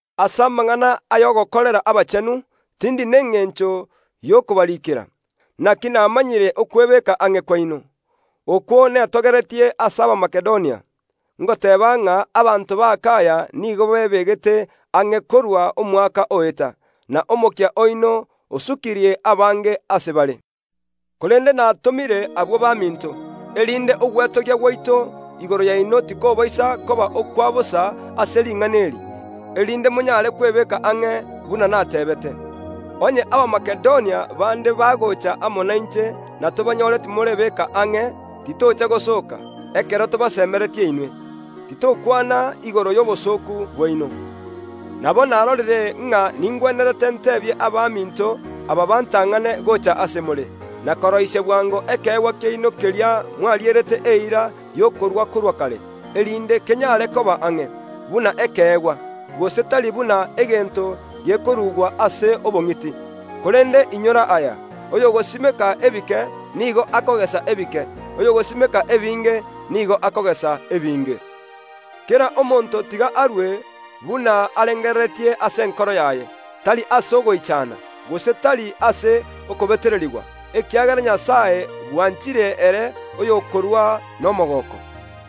Ase amang’ana y’ogokorera abachenu, tindi nengencho y’okobariikera. Naki namanyire okwebeka ang’e kwaino, okwo netogeretie ase Abamakedonia, ngoteeba ng’a abanto b’Akaya nigo bebegete ang’e korwa omwaka oeta, na omokia oino osukirie abange ase bare. Korende natomire abwo baminto, erinde ogwetogia gwaito igoro yaino tikobaisa koba okwa bosa ase ring’ana eri, erinde monyare kwebeka ang’e buna nateebete. Onye Abamakedonia bande bagocha amo nainche na tobanyore timorebeka ang’e, titocha gosooka, ekero tobasemeretie inwe. Titokwana igoro y’obosooku bwaino. Nabo narorire ng’a ningwenerete ntebie abaminto aba bantang’ane gocha ase more, na koroisia bwango ekeegwa kiaino keria mwarierete eira y’okorua korwa kare, erinde kenyare koba ang’e, buna ekeegwa, gose tari buna egento gekorugwa ase obong’iti. Korende inyora aya, oyogosimeka ebike nigo akogesa ebike; oyogosimeka ebinge nigo akogesa ebinge. Kera omonto tiga arue buna arengereretie ase enkoro yaye, tari ase ogoichana, gose tari ase okobetererigwa, ekiagera Nyasae bwanchire ere oyokorua nomogooko.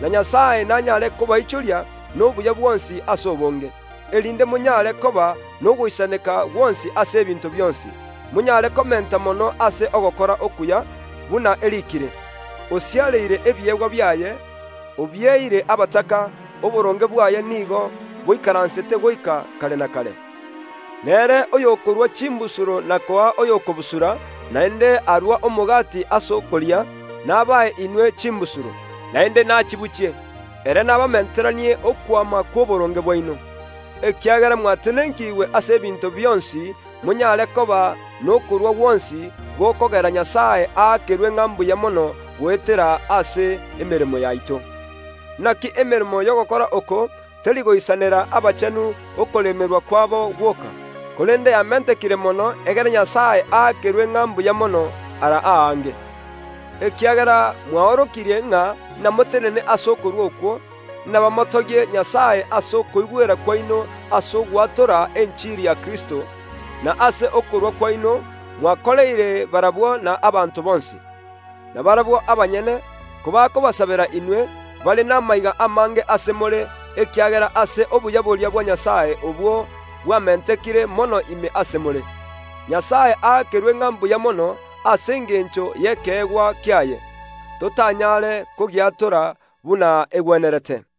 Na Nyasae nanyare kobaichoria nobuya bwonsi ase obonge, erinde monyare koba nogoisaneka gwonsi ase ebinto bionsi, monyare komenta mono ase ogokora okuya, buna eriikire, “Osiareire ebiegwa biaye, obieire abataka, oboronge bwaye nigo boikaransete goika kare na kare.” Nere oyokorua chimbusuro na koa oyo okobusura, naende arua omogati ase okoria, nabae inwe chimbusuro, naende nachibuchie, ere nabamenteranie okwama kw’oboronge bwaino. Ekiagera mwatenenkigwe ase ebinto bionsi monyare koba nokorua gwonsi gokogera Nyasae aakerwe ng’a mbuya mono goetera ase emeremo yaito. Naki emeremo y’ogokora oko teri goisanera abachenu okoremerwa kwabo gwoka, korende yamentekire mono egere Nyasae aakerwe ng’a mbuya mono ara aange. Ekiagera mwaorokirie ng’a namotenene ase okorua okwo, abanto inabamotogie Nyasae ase okoigwera kwaino ase ogwatora enchiri ya Kristo, na ase okorua kwaino mwakoreire barabwo na abanto bonsi. Na barabwo abanyene, kobakobasabera inwe, bare namaiga amange ase more, ekiagera ase obuya boria bwa Nyasae obwo bwamentekire mono ime ase more. Nyasae aakerwe ng’a mbuya mono ase engencho y’ekeegwa kiaye, totanyare kogiatora buna egwenerete!